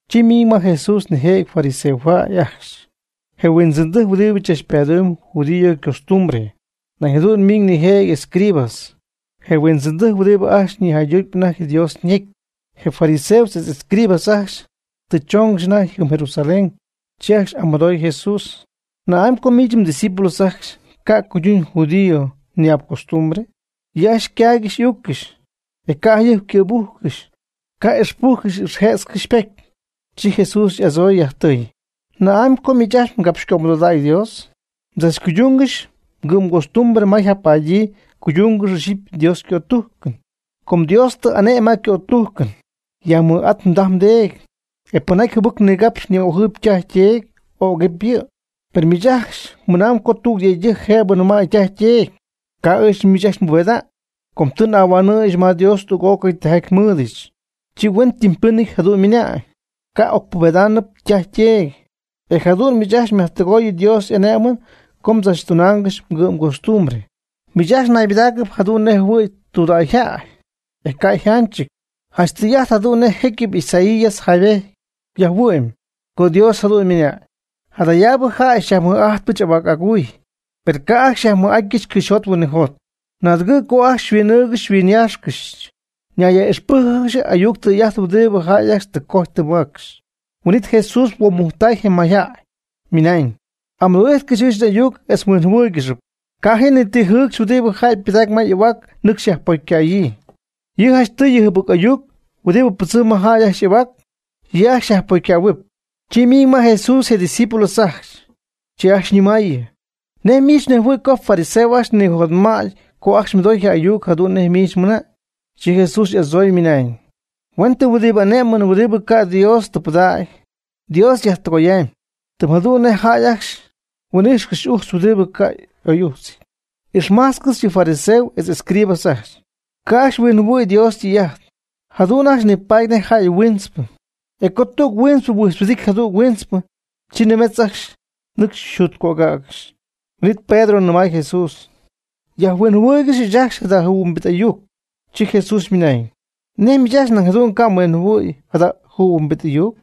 Chi ymiiñ ma Jesús nijëjɨty fariseo jäy ajcxy, je huindzɨndɨjc huɨdibɨ tzachpadumb judío ycostumbre. Nañ jadu'n miiñ nijëjɨty escribas, je huindzɨndɨjc huɨdibɨ ajcxy nïjaydutp anajty Dios ñecy. Je fariseos etz escribas ajcxy tɨ choongɨxy anajty jɨm Jerusalén, chi ajcxy y'amɨdooy Jesús: ―¿Na'amy co miich mdiscípulos ajcxy ca' cuydungɨxy judío ñi'ap costumbre? Yɨ' ajcxy ycaaygɨxy y'uuccɨxy, e ca' jayɨjp ycɨ̈bujcɨxy, ca' ixpujcɨxy ixjëtzcɨxy ypocy. Chi Jesús y'adzooy, yajtɨɨy: ―¿Na'amy co miich ajcxy mgapxycömɨdodägy Dios? Mdzachcuydungɨxy mgɨ'mgostumbre ma yjapadyii mguydungɨxy ixyipy Dios ycötújcɨn. Com Dios tɨ y'ane'my ma ycötujcɨn: “Yajmɨj'at mdaj mdeedy, e pɨnjaty jɨbɨc nigapxy ni'ojɨɨyb ytaj yteedy, ögɨpy yɨ'.” Per miich ajcxy mɨnamb co tüg je yëydɨjc jëbɨ nɨmäy ytaj yteedy: “Ca' ɨɨch miich ajcxy nbubeda'ñ, com tɨ n'ahuanɨ̈yɨch ma Dios tüg'ócɨy tijaty nmɨɨdɨch.” Chi huen ytɨmpɨnɨty jadu'n mɨnamb, ca' ocpubedaanɨp ytaj yteedy, e jadu'n miich ajcxy myajtɨgoy Dios y'ane'mɨn com tzachtunaangɨxy mgɨ'mgostumbre. Miich ajcxy naybɨdaacɨp jadu'n nej jɨhuɨ̈y tudägy jäy, e ca' yjanchɨty. Janch tɨy'ajt jadu'n nej jecyɨp Isaías jaaybejty yajhuɨ'my co Dios jadu'n ymɨnañ: Jadayaabɨ jäy xyajmɨj'ajtpɨch ahuac aguy, per ca' ajcxy xyajmɨj'atyɨch cɨxyjot huinɨjot. Naadɨgɨ' co ajcxy xyhuin'ɨ́ɨygɨxyɨch xyhuinyáaxcɨxyɨch. Mnayyaj'ixpɨ́jcɨgɨxy ayuc tɨy'ajt huɨdibɨ jäy ajcxy tɨ cojy tɨ maacxy. Huin'it Jesús huomujctay je mayjäy, ymɨnañ: ―Amɨdoo'ijtcɨxy ɨɨch n'ayuc etz mhuinjɨhuɨ́ɨygɨxɨp. Ca' ji ni ti jɨɨcxy huɨdi jäy ypɨdacpy ma y'ahuac nɨcxy yajpocycäyii. Yɨ' janchtɨy je jɨbɨc ayuc huɨdibɨ pɨdzɨm ma jäy ajcxy y'ahuac, yɨ' ajcxy yajpocycähuɨɨb. Chi ymiiñ ma Jesús je' ydiscípulos ajcxy, chi ajcxy ñɨmaayɨ: ―¿Nej miich mnejhuɨɨyb co je fariseos ajcxy ñijotma'tpy co ajcxy mɨdoy je ayuc jadu'n nej miich mɨnañ? Chi Jesús y'adzooy, ymɨnañ: ―Huen tɨm huɨdibɨ ane'mɨn huɨdibɨ ca' Dios tɨ pɨdägy, Dios yajtɨgoyam, tɨm jadu'n nej jäy ajcxy huijxɨ̈gy ujtz huɨdibɨ ca' y'oy'ujtzɨty. Ixmajtzcɨx yɨ fariseos etz escribas ajcxy. Ca' ajcxy huinjɨhuɨ̈y Dios ytɨy'ajt. Jadu'n ajcxy nipaady nej jäy huintzpɨ, e co tüg huintzpɨ huijtzhuɨdity jadüg huintzpɨ, chi nimetz nɨcxy yjutcögägɨxy. Huin'it Pedro nɨmay Jesús: ―Yajhuinjɨhuɨɨyg ɨɨch ajcxy jada jɨhuimbit ayuc. Chi Jesús ymɨnañ: ―¿Nej miich ajcxy nañ jadu'n ca' mhuinjihuɨ̈y jada jɨhuimbit ayuc?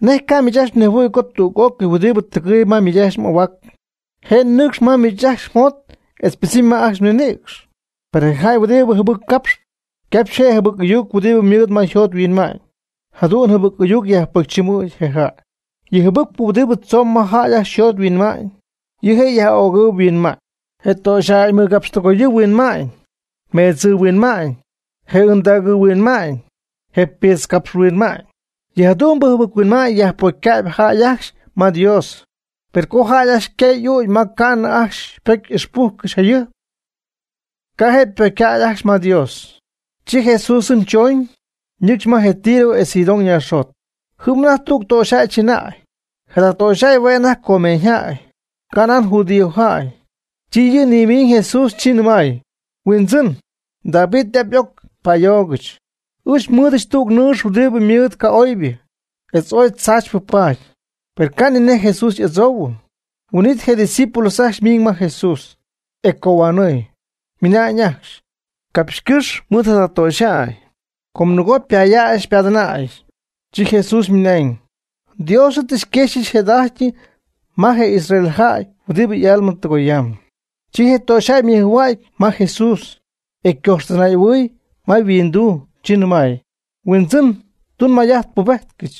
¿Nej ca' miich ajcxy mnejhuɨ̈y co tüg'ócɨy huɨdibɨ tɨgɨɨyb ma miich ajcxy m'ahuac, je' nɨcxp ma miich ajcxy mjot etz ypɨdzɨmy ma ajcxy mninïcx? Per je jäy huɨdibɨ jɨbɨc capxp, capxp je' je jɨbɨc ayuc huɨdibɨ ymɨɨd ma yjot yhuinma'ñ. Jada jɨbɨc ayuc yajpocychɨmɨ̈cp je jäy. Yɨ jɨbɨcpɨ huɨdibɨ tzomb ma jäy ajcxy yjot yhuinma'ñ, yɨ' je' jäyyaj'ögɨɨ huinma'ñ, je töxyjäy mɨgapxtɨgoyɨɨ huinma'ñ, meedzɨɨ huinma'ñ, je ɨndägɨɨ huinma'ñ, je piitz capx huinma'ñ. Yɨjadu'mbɨ jɨbɨc-huinma'ñ yajpocycäb jäy ajcxy ma Dios. Per co jäy ajcxy ycaay y'ügy, ma ca'nɨ ajcxy pocy ixpujcɨxy jayɨjp, ca' je' ypocycäy ajcxy ma Dios. Chi Jesús jɨm chooñ, nɨcxy ma je Tiro etz Sidón naaxjot. Jɨm anajty tüg töxyjäy chɨnäy. Jada töxyjäy hue' anajty cananeajäy, canan judíojäy. Chi yɨ' nimiiñ Jesús, chi nɨmay: ―Huindzɨn, David y'ap y'oc, pa'ayoogɨch. Ɨɨch nmɨɨdɨch tüg nɨɨx huɨdibɨ ymɨɨd ca'oybɨ etz oy tzaachypɨ paady. Per ca' ni nej Jesús y'adzoohuɨ. Huin'it je' ydiscípulos ajcxy miiñ ma Jesús, e ycohuanɨɨy, mɨnañ ajcxy: ―Capxycɨ́x mɨɨd jada töxyjäy, com nɨgo xypayaax xypadɨnaayɨm. Chi Jesús ymɨnañ: ―Dios ɨɨch tɨ xyquexyɨch jëda'ajty ma je israelitasjäy huɨdibɨ y'alma tɨgoyam. Chi je töxyjäy ymɨjhua'cɨ ma Jesús, e ycojxtɨnay'ɨhuɨy ma je yhuinduu, chi ymɨnañ: ―Huindzɨn, tun may'ajt pubejtcɨch.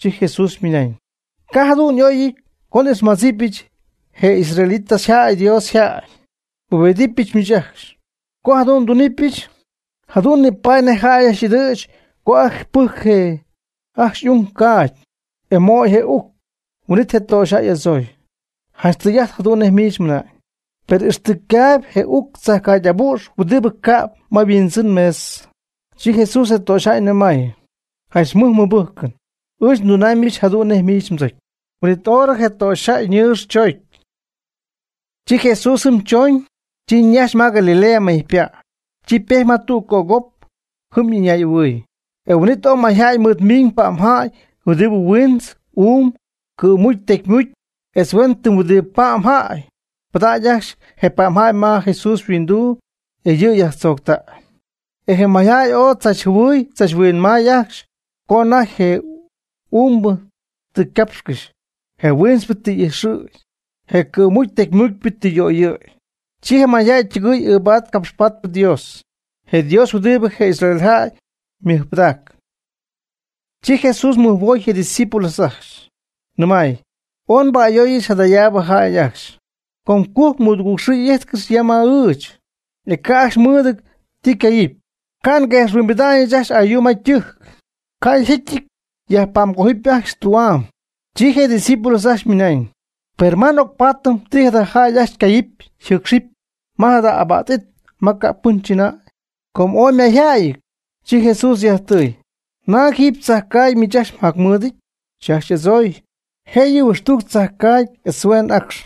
Chi Jesús ymɨnañ: ―Ca' jadu'n y'oyɨty co n'ixmadzipɨch je israelitasjäy (Dios yjäy), e nbubedɨpɨch miich ajcxy. Co jadu'n ndunɨpɨch, jadu'n nipaadɨp nej jäy ajcxy y'ɨdɨ̈ch co ajcxy pɨjcɨ je ajcxy y'ung ycaagy, e möy je uc. Huin'it je töxyjäy y'adzooy: ―Janch tɨy'ajt jadu'n nej miich mɨna'ñ, per ixtɨ ycaayb je uc je tzajcaagy y'abu'x huɨdibɨ cäb ma yhuindzɨn mesa. Chi Jesús je töxyjäy nɨmay: ―Janch mɨj mmɨbɨjcɨn. Ɨɨch ndunaamybɨch jadu'n nej miich mdzocy. Huin'it horɨ je töxyjäy ñɨɨx choocy. Chi Jesús jɨm chooñ. Chi ñajxy ma Galilea mejypa'. Chi ypejty ma tüg cögop, jɨm ɨñay'ɨhuɨɨy. E huin'it oy mayjäy mɨɨdmiiñ pa'mjäy huɨdibɨ huintz, uum, cɨ̈mucy tecymucy, etz huen tɨm huɨdibɨ pa'mjäy. Pɨdacy ajcxy je pa'mjäy ma Jesús yhuinduu, e yɨ' yajtzooctay. E je mayjäy ooy tzachjɨhuɨɨy tzachhuinmaay ajcxy co anajty je uumbɨ tɨ capxɨ̈gy, je huintzpɨ tɨ y'ijxɨ̈gy, je cɨ̈mucpy tecymucpyɨ tɨ yöyɨ̈gy. Chi je mayjäy ytɨgɨɨy ɨɨbaady capxpaady Dios, je Dios huɨdibɨ je Israel jäy ymɨjpɨdacpy. Chi Jesús mɨjhuoy je' ydiscípulos ajcxy, nɨmay: ―Ooy nba'ayooyɨch jadayaab jäy ajcxy. Com cujc mɨdugɨɨg xɨɨ ijtcɨxy ya mɨɨd ɨɨch etz ca' ajcxy mɨɨdɨty ti ycaayɨpy. Ca' nguexhuimbida'ñɨch ajcxy ayuu ma ytɨjc, ca' yjetyɨty yajpa'mgojɨp ajcxy tü'am. Chi je' ydiscípulos ajcxy mɨnañ: ―¿Per ma n'ocpatɨm ti jada jäy ajcxy ycaayɨpy yjɨɨcxɨpy ya ma jada abac it ma ca' pɨn chɨnäy? Co ooy mayjäyɨty. Chi Jesús yajtɨɨy: ―¿Naag jiiby tzajcaagy miich ajcxy mjacmɨɨdɨty? Chi ajcxy y'adzooy: ―Jëyɨ huɨxtujc tzajcaagy etz hueen acx.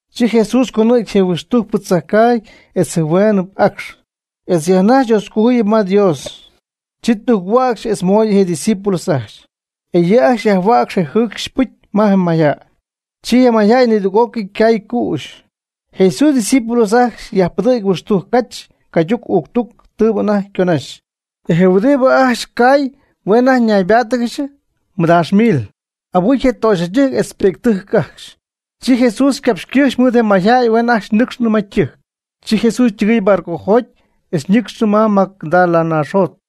Chi Jesús conɨ̈gy je huɨxtujcpɨ tzajcaagy etz je hueenɨp acx, e yajnajx Dioscojuyɨp ma Dios. Chi tujc-hua'cx etz moy je' ydiscípulos ajcxy. E yɨ' ajcxy yajhua'cx je jɨcxy pɨcy ma je mayjäy. Chi je mayjäy nidüg'ócɨy ycay cüxɨ. Jesús ydiscípulos ajcxy yajpɨdɨ̈gy huɨxtujc cach cayduc uuctuc tɨɨbɨ anajty yconaxy. E je huɨdibɨ ajcxy cay hue' anajty naybáatɨgɨxy nimɨdaax mil, abɨcy je töxyjäydɨjc etz pi'ctɨjc ajcxy. Chi Jesús ycapxycɨ́xy mɨɨd je mayjäy huen ajcxy nɨ́cxcɨxyñɨ ma ytɨjc. Chi Jesús ytɨgɨɨy barcojoty etz ñɨcxnɨ ma Magdala naax jot.